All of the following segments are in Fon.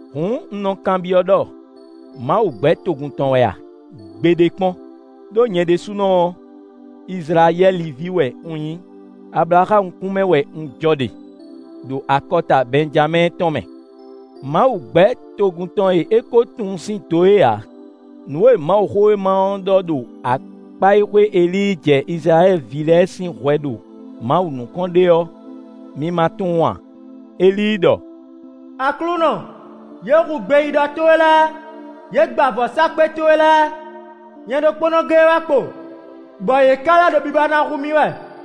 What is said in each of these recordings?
Hǔn, un nɔ kanbyɔ́ ɖɔ: Mawu gbɛ̌ togun tɔn wɛ a? Gbeɖé kpɔ́n! Đó nyɛ ɖésúnɔ ɔ́, Izlayɛ́li ví wɛ un nyí; Ablaxámu kún mɛ wɛ un jɔ ɖe, ɖo akɔta Bɛnjamɛ́ɛ tɔn mɛ. Mawu gbɛ̌ togun tɔn e é ko tunwun sín do é ǎ; nǔ e Mawuxówéma ɔ́ ɖɔ ɖo akpá e xwé Elíi jɛ Izlayɛ́li ví lɛ́ɛ sín hwɛ ɖo Mawu nukɔn ɖe ɔ́, mi ma tunwun a? Elíi ɖɔ: “Aklúnɔ, yě hu gbeyíɖɔ towe lɛ́ɛ; yě gba vɔ̌sákpe towe lɛ́ɛ; nyɛ ɖokpónɔ géé wɛ kpo, bɔ yě ka lɛ́ ɖo biba na hu mì wɛ.”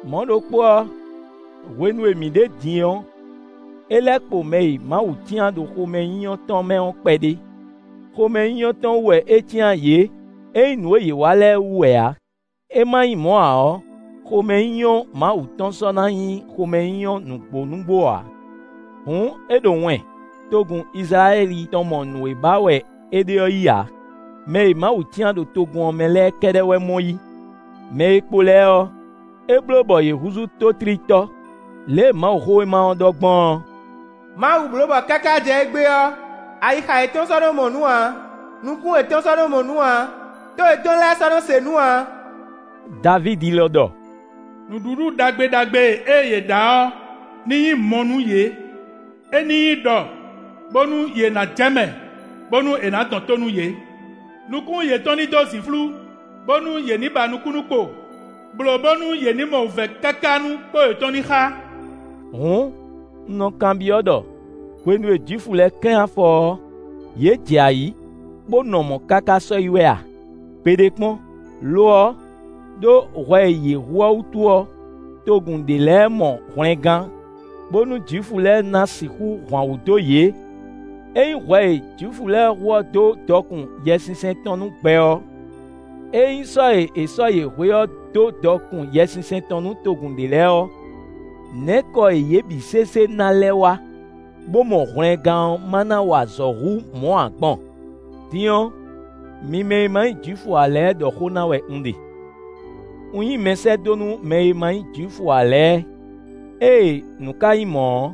Mɔ̌ ɖokpó ɔ́, hwenu e mǐ ɖe din ɔ́, é lɛ́ kpo mɛ e Mawu cyán ɖo xomɛnyínyɔ́ tɔn mɛ ɔ́ kpɛɖé. Xomɛnyínyɔ́ tɔn wú wɛ é cyán yě; é nyí nǔ e yě wa lɛ́ɛ wú wɛ ǎ; é ma nyí mɔ̌ ǎ ɔ́, xomɛnyínyɔ́ Mawu tɔn sɔ́ na nyí xomɛnyínyɔ́ nǔgbó nǔgbó ǎ. Hǔn, é ɖo wɛn: togun Izlayɛ́li tɔn mɔ nǔ e ba wɛ é ɖe ɔ́ yí ǎ. Mɛ e Mawu cyán ɖo togun ɔ́ mɛ lɛ́ɛ kɛ́ɖɛ́ wɛ mɔ yí; mɛ e kpo lɛ́ɛ ɔ́, é bló bɔ yě húzú tótlítɔ́. Lě e Mawuxówéma ɔ́ ɖɔ gbɔn ɔ́: “Mawu bló bɔ káká jɛ égbé ɔ́, ayixa yětɔn sɔ́ nɔ mɔ nǔ ǎ; nukún yětɔn sɔ́ nɔ mɔ nǔ ǎ, tó yětɔn lɛ́ɛ sɔ́ nɔ se nǔ ǎ.” Davídi lɔ ɖɔ: “Nǔɖuɖu ɖagbe ɖagbe e yě ɖa ɔ́ ní nyí mɔ nú yě; é ní nyí ɖɔ, bónú yě ná jɛ mɛ, bónú è nǎ dɔn tó nú yě. Nukún yětɔn ní dó zǐnflú, bónú yě ní ba nukúnnú kpo; blǒ bónú yě ní mɔ wǔvɛ́ káká nú kpó yětɔn ní xá.” Hǔn, un nɔ kanbyɔ́ ɖɔ: “Hwenu e Jwifu lɛ́ɛ klɛ́n afɔ ɔ́, yě jɛ ayǐ bó nɔ mɔ̌ káká sɔ́yi wɛ a?” Gbeɖé kpɔ́n! Lo ɔ́, ɖó hwɛ e yě hu ɔ́ wútu ɔ́, togun ɖě lɛ́ɛ mɔ hwlɛngán, bónú Jwifu lɛ́ɛ ná sixú hwan wǔ dó yě. Ényí hwɛ e Jwifu lɛ́ɛ hu ɔ́ dó dɔkun Yɛsinsɛn tɔn nú gbɛ ɔ́, ényí sɔ́ e è sɔ́ yě hwe ɔ́ dó dɔkun Yɛsinsɛn tɔn nú togun ɖě lɛ́ɛ ɔ́, nɛ̌ kɔ e yě bǐ sésé ná lɛ́ wá, bó mɔ hwlɛngán ɔ́ ma na wa azɔ̌ hú mɔ̌ ǎ gbɔn? Din ɔ́, mi mɛ e ma nyí Jwifu ǎ lɛ́ɛ ɖɔ xó ná wɛ un ɖe: un nyí mɛsɛ́dó nú mɛ e ma nyí Jwifu ǎ lɛ́ɛ; ée nǔ ka nyí mɔ̌ ɔ́,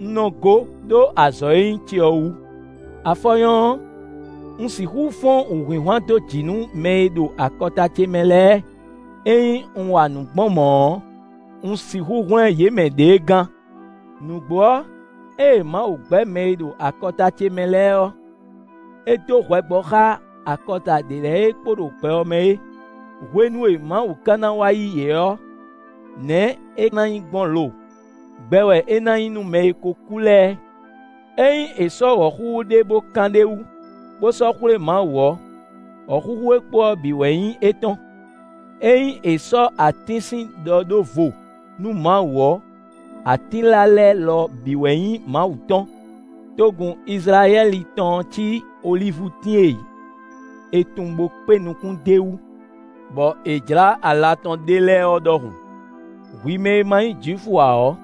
un nɔ gó ɖó azɔ̌ e nyí ce ɔ́ wú. Afɔ nyɔ́ ɔ́, un sixú fɔ́n wǔhwinhwan dó jǐ nú mɛ e ɖo akɔta ce mɛ lɛ́ɛ; ényí un wa nǔ gbɔn mɔ̌ ɔ́, un sixú hwlɛ́n yě mɛ ɖěe gán. Nǔgbó ɔ́, ée Mawu gbɛ́ mɛ e ɖo akɔta ce mɛ lɛ́ɛ ɔ́, é dó hwɛ gbɔ xá akɔta ɖě lɛ́ɛ e kpo ɖo gbɛ ɔ́ mɛ é. Hwenu e Mawu ka ná wá yí yě ɔ́, nɛ̌ é ná nyí gbɔn lo? Gbɛ wɛ é ná nyí nú mɛ e ko kú lɛ́ɛ. Ényí è sɔ́ wɔ̌xúxú ɖé bó kán ɖ'é wu, bó sɔ́ xwlé Mawu ɔ́, wɔ̌xúxú e kpo ɔ́ bǐ wɛ nyí étɔn. Ényí è sɔ́ atín sín ɖɔ ɖó vo nú Mawu ɔ́, atínla lɛ́ɛ lɔ bǐ wɛ nyí Mawu tɔn. Togun Izlayɛ́li tɔn ɔ́ cí olívutín e è tun bó kpé nukún d'é wú, bɔ è jlǎ ala tɔn ɖé lɛ́ɛ ɔ́ ɖɔhun. Hwi mɛ e ma nyí Jwifu ǎ ɔ́,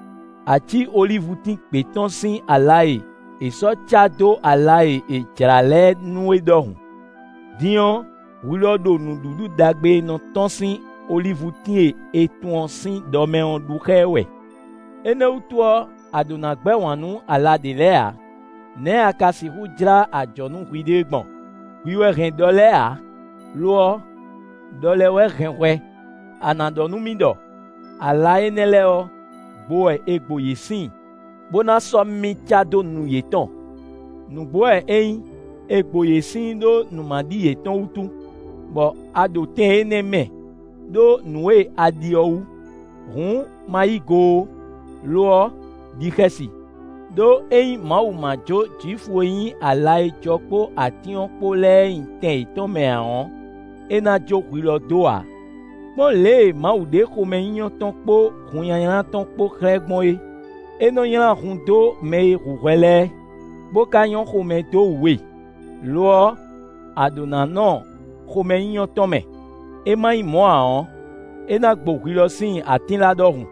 a cí olívutín gbě tɔn sín ala e è sɔ́ cá dó ala e è jlǎ lɛ́ɛ nu é ɖɔhun. Din ɔ́, hwi lɔ ɖo nǔɖuɖu ɖagbe e nɔ tɔ́n sín olívutín e è tun ɔ́ sín ɖɔ mɛ ɔ́ ɖu xá ɛ wɛ. Énɛ́ wútu ɔ́, a ɖǒ na gbɛ́ wǎn nú ala ɖě lɛ́ɛ ǎ. Nɛ̌ a ka sixú jlá ajɔ̌ nú hwiɖée gbɔn? Hwi wɛ hɛn ɖɔ lɛ́ɛ ǎ, lo ɔ́, ɖɔ lɛ́ɛ wɛ hɛn hwɛ. A nǎ ɖɔ nú mì ɖɔ: “Ala énɛ́ lɛ́ɛ ɔ́, gbo wɛ è gbo yě síin, bó ná sɔ́ mì cá dó nu yětɔn.” Nǔgbó wɛ é nyí. È gbo yě síin ɖó nǔmaɖi yětɔn wútu, bɔ a ɖo tɛn énɛ́ mɛ, ɖó nǔ e a ɖi ɔ́ wú. Hǔn ma yí go ó, lo ɔ́, ɖi xɛsi. Đó ényí Mawu ma jó Jwifu e nyí ala e jɔ kpó atín ɔ́ kpó lɛ́ɛ nyi tɛn yětɔn mɛ ǎ ɔ́, é ná jó hwi lɔ dó ǎ. Kpɔ́n lě e Mawu ɖe xomɛnyínyɔ́ tɔn kpó hunnylánylá tɔn kpó xlɛ́ gbɔn é: é nɔ́ nylá hun dó mɛ e hu hwɛ lɛ́ɛ, bó ka nyɔ́ xomɛ dó wú we; lo ɔ́, a ɖǒ ná nɔ xomɛnyínyɔ́ tɔn mɛ; é ma nyí mɔ̌ ǎ ɔ́, é ná gbo hwi lɔ síin atínla ɖɔhun.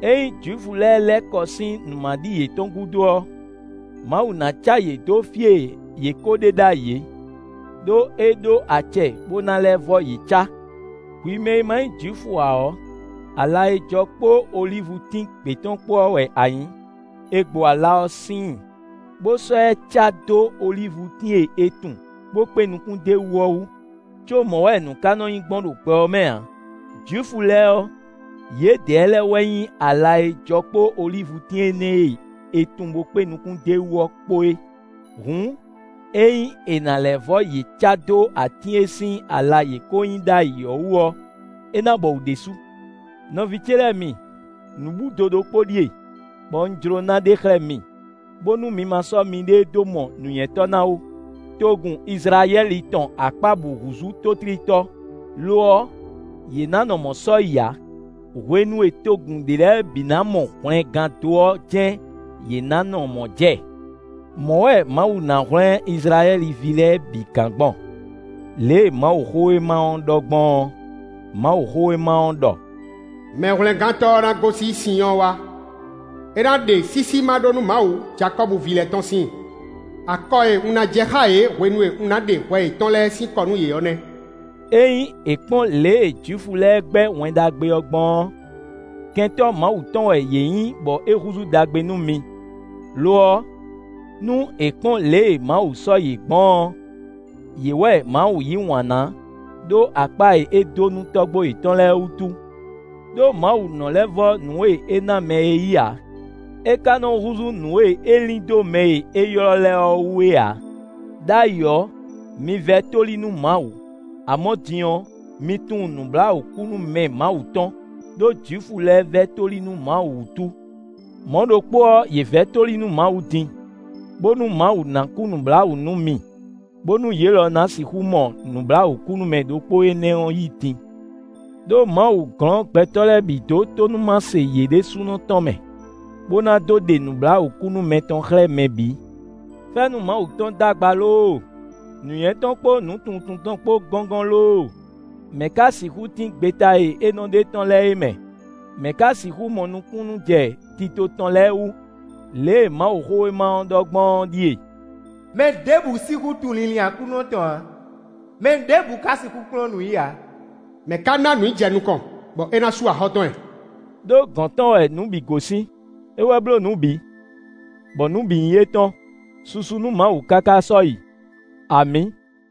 Ényí Jwifu lɛ́ɛ lɛ́ kɔ sín nǔmaɖi yětɔn gúdo ɔ́, Mawu ná cá yě dó fí e yě ko ɖe ɖ'ayǐ é; ɖó é ɖó acɛ bó ná lɛ́ vɔ́ yě cá. Hwi mɛ e ma nyí Jwifu ǎ ɔ́, ala e jɔ kpó olívutín gbě tɔn kpó ɔ́ wɛ a nyǐ: è gbo ala ɔ́ síin, bó sɔ́ ɛ cá dó olívutín e è tun bo kpé nukún d'é wú ɔ́ wú, có mɔ̌ wɛ nǔ ka nɔ́ nyí gbɔn ɖo gbɛ ɔ́ mɛ ǎ. Jwifu lɛ́ɛ ɔ́, yědɛɛ lɛ́ɛ wɛ nyí ala e jɔ kpó olívutín énɛ́ e è tun bó kpé nukún d'é wú ɔ́ kpó é. Hǔn, ényí è nǎ lɛ́ vɔ́ yě cá dó atín e sín ala yě ko nyí ɖ'ayǐ ɔ́ wú ɔ́, é ná bɔwǔ ɖésú. Nɔví ce lɛ́ɛ mi, nǔbúdo ɖokpó ɖíe, bɔ un jló ná ɖe xlɛ́ mi, bónú mi ma sɔ́ miɖée dó mɔ nǔnywɛ́tɔ́ ná ó: togun Izlayɛ́li tɔn akpá bǔ húzú tótlítɔ́. Lo ɔ́, yě ná nɔ mɔ̌ sɔ́yi ǎ; hwenu e togun ɖě lɛ́ɛ bǐ ná mɔ hwlɛngán dó ɔ́ jɛ́n yě ná nɔ mɔ̌ jɛ. Mɔ̌ wɛ Mawu ná hwlɛ́n Izlayɛ́li ví lɛ́ɛ bǐ gán gbɔn; lě e Mawuxówéma ɔ́ ɖɔ gbɔn ɔ́; Mawuxówéma ɔ́ ɖɔ: “Mɛhwlɛ́ngántɔ́ ɔ́ ná gosín Sinyɔ́ɔ wá; é ná ɖe sísí ma ɖó nú Mawu Jakɔ́bu ví lɛ́ɛ tɔn síin. Akɔ e un ná jɛ xá yě hwenu e un ná ɖe hwɛ yětɔn lɛ́ɛ sín kɔ nú yě ɔ́ nɛ́.” Ényí è kpɔ́n lě e Jwifu lɛ́ɛ gbɛ́ Wɛn Ɖagbe ɔ́ gbɔn ɔ́, kɛntɔ́ Mawu tɔn wɛ yě nyí bɔ é húzú ɖagbe nú mi; lo ɔ́, nú è kpɔ́n lě e Mawu sɔ́ yě gbɔn ɔ́, yě wɛ Mawu yí wǎn ná ɖó akpá e é dó nú tɔ́gbó yětɔn lɛ́ɛ wútu. Đó Mawu nɔ lɛ́ vɔ́ nǔ e é ná mɛ é yí ǎ; é ka nɔ húzú nǔ e é lin dó mɛ e è ylɔ́ lɛ́ɛ ɔ́ wú é ǎ. Đ'ayǐ ɔ́, mi vɛ́ tóli nú Mawu; amɔ̌ din ɔ́, mi tunwun nǔbláwǔkúnúmɛ Mawu tɔn, ɖó Jwifu lɛ́ɛ vɛ́ tóli nú Mawu wútu. Mɔ̌ ɖokpó ɔ́, yě vɛ́ tóli nú Mawu din, bónú Mawu ná kú nǔbláwǔ nú mi, bónú yě lɔ ná sixú mɔ nǔbláwǔkúnúmɛ ɖokpó énɛ́ yí din. Đó Mawu glɔ́n gbɛtɔ́ lɛ́ɛ bǐ dó tónúmase yě ɖésúnɔ tɔn mɛ, bó ná dó ɖe nǔbláwǔkúnúmɛ tɔn xlɛ́ mɛ bǐ. Fɛ́nú Mawu tɔn d'agba lóóo! Nǔnywɛ́ tɔn kpó nǔtunwuntunwun tɔn kpó gɔ́ngɔ́n lóóo! Mɛ̌ ka sixú tín gbeta e é nɔ ɖe tɔ́n lɛ́ɛ é mɛ? Mɛ̌ ka sixú mɔ nukúnnú jɛ tito tɔn lɛ́ɛ wú? Lě e Mawuxówéma ɔ́ ɖɔ gbɔn ɔ́ ɖíe: “Mɛ ɖěbǔ sixú tunwun linlin Aklúnɔ tɔn ǎ. Mɛ ɖěbǔ ka sixú kplɔ́n nǔ i ǎ.” Mɛ̌ ka ná nǔ i jɛ nukɔn bɔ é ná sú axɔ́ tɔn ɛ? Đó gɔ̌n tɔn wɛ nǔ bǐ gosín; é wɛ bló nǔ bǐ, bɔ nǔ bǐ nyí étɔn. Susu nú Mawu káká sɔ́yi. Amǐ!